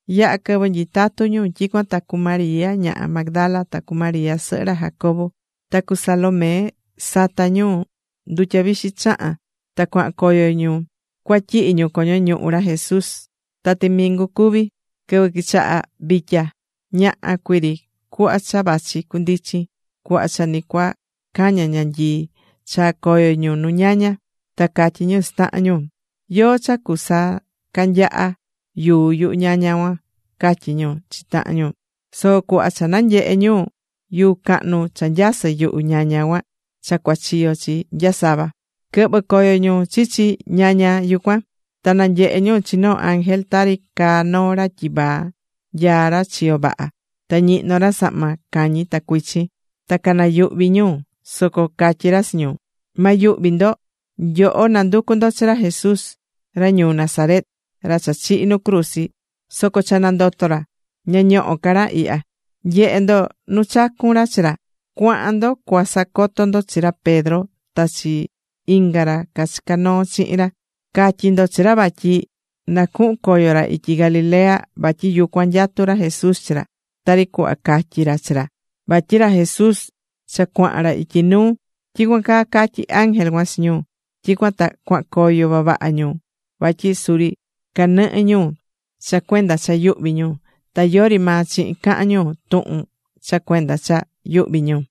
Yaha̱ quɨvɨ nyitatú ñu. Tyicuan ta cu María ñaha Magdala ta cu María sɨhɨ ra Jacobo, ta cu Salomé sata̱ ñu ndutya vixi chahán ta cuahan coyo ñu cua tyihi ñu coño ñuhu ra Jesús. Ta timingu cuví, quɨvɨ quichaha vitya, ñaha cuii ri cuhva cha vachi cundichin cuhva cha ni cua caña̱ ñanyii, chaa̱ coyo ñu nu ñaña. Ta catyí ñu chi tahan ñu: ―¿Yóó cha cusacanyaha yuu yuhu ñaña cuan? ―catyí ñu chi tahan ñu. Soco cuhva cha nanyehe̱ ñu, yuu cahnu cha nyasɨ̱ yuhu ñaña cuan cha cuachiyo̱ chi nya sava. Quɨhvɨ̱ coyo ñu chichi ñaña yucuan. Ta nanyehe̱ ñu chi noo ángel tari caa noo ra tyivaa, nyaá ra chiyo vaha. Ta ñihnó ra sahma cañi ta cuichin. Ta canayuhví ñu. Soco catyí ra chi ñu: ―Ma yuhvi ndo. Nyoho nanducú ndo chi ra Jesús ra ñuu Nazaret, ra cha chihi̱ nu cruzi. Soco cha nandoto̱ ra. Ña ñohó ca ra ihya. Nye̱he ndo nu chacu̱n ra chi ra. Cua̱han ndo cua sacoto ndo chi ra Pedro ta chi inga ra cachica̱ noo chihin ra. Ca̱tyi ndo chi ra vatyi na cuhun coyo ra ityi Galilea vatyi yucuan nyatú ra Jesús chi ra, tari cuhva catyi̱ ra chi ra. Vatyi ra Jesús cha cuahan ra ityi nuu ―tyicuan caa catyí ángel cuan chi ñu. Tyicuan ta cuahan coyo vavaha ñu, vatyi suri canɨhɨ́ ñu cha cuenda cha yuhví ñu. Ta yori maa chihin cahán ñu tuhun cha cuenda cha yuhví ñu.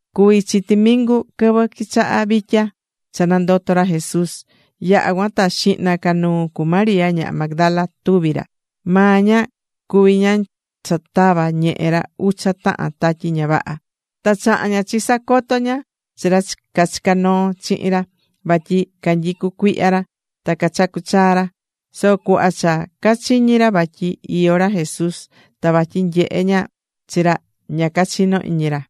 Cuví chi timingu quɨvɨ quichaha vitya cha nandoto̱ ra Jesús. Yaha̱ cuan ta xihna ca nuu cu María ñaha Magdala tuvi̱ ra. Maa ña cuví ñaha cha tava̱ ñehe ra ucha tahan tatyi ña vaha. Ta chaha̱n ña chisacoto ña chi ra cachica̱ noo chihin ra, vatyi canyicú cuihya ra ta cachacú chaa ra. Soco cuhva cha cachiñi̱ ra vatyi iyó ra Jesús ta vatyi nyehe̱ ña chi ra, ña cachino̱ iñi ra.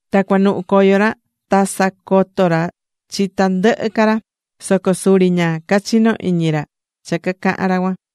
Ta cuanuhu coyo ra ta sacoto̱ ra chi tandɨhɨ ca ra. Soco suri ña cachino̱ iñi ra cha cacaha̱n ra cuan.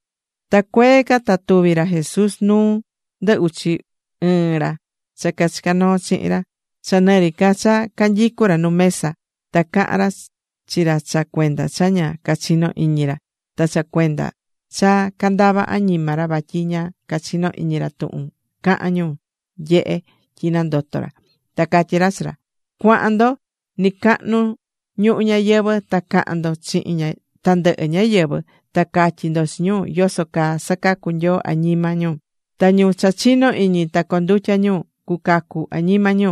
Ta cuee ca ta tuvi̱ ra Jesús nuu ndɨ uchi ɨɨn ra cha cachica̱ noo chihin ra, cha nɨ ri ca cha canyicú ra nu mesa. Ta caha̱n ra chi ra cha cuenda cha ña cachinó iñi ra, ta cha cuenda cha candava añima ra vatyi ña cachino̱ iñi ra tuhun caha̱n ñu nyehe̱ tyi nandoto̱ ra. Ta catyí ra chi ra: ―Cua̱han ndo nɨcacahnu ñuhu ñayɨvɨ̱, ta ca̱han ndo chihin tandɨhɨ ñáyɨvɨ, ta ca̱tyi ndo chi ñu yoso caa sacacú Nyoo añima ñu. Ta ñu cha chinó iñi ta condutya ñu, cucacu añima ñu.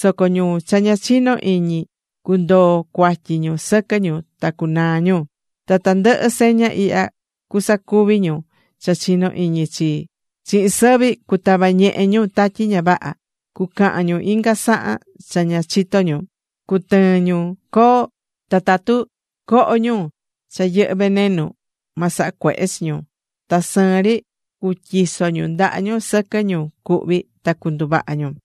Soco ñu cha ña chinó iñi cundoo cuatyi ñu sɨquɨ ñu ta cunaa ñu. Ta tandɨhɨ seña ihya cusacuvi ñu cha chinó iñi chii: Chihin sɨvi cutava ñehe ñu tatyi ña vaha. Cucahan ñu inga sahan cha ña chitó ñu. Cutɨɨn ñu coo, ta tatu coho ñu cha yɨhɨ́ venenu, ma saha cuehe chi ñu. Ta sɨɨn ri cutyiso ñu ndaha ñu sɨquɨ ñu cuhví, ta cunduvaha ñu.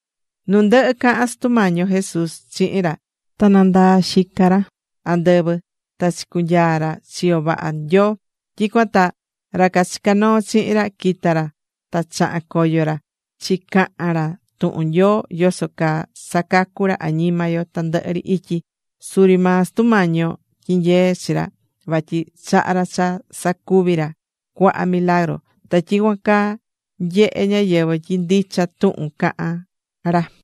Nu ndɨhɨ caha̱n Sutu Mañi yo Jesús chihin ra, ta nandaa̱ xica ra andɨvɨ, ta chicunyaa̱ ra chiyo vaha Nyoo. Tyicuan ta ra cachica̱ noo chihin ra quita̱ ra ta chaha̱n coyo ra chicaha̱n ra tuhun Nyoo yoso caa sacacú ra añima yo tandɨhɨ ri ityi. Suri maa Sutu Mañi yo tyinyee̱ chi ra vatyi chaha̱ ra cha sacuvi ra cuaha milagru. Ta tyicuan caa nyehé ñáyɨvɨ tyi ndicha tuhun cacahán ra.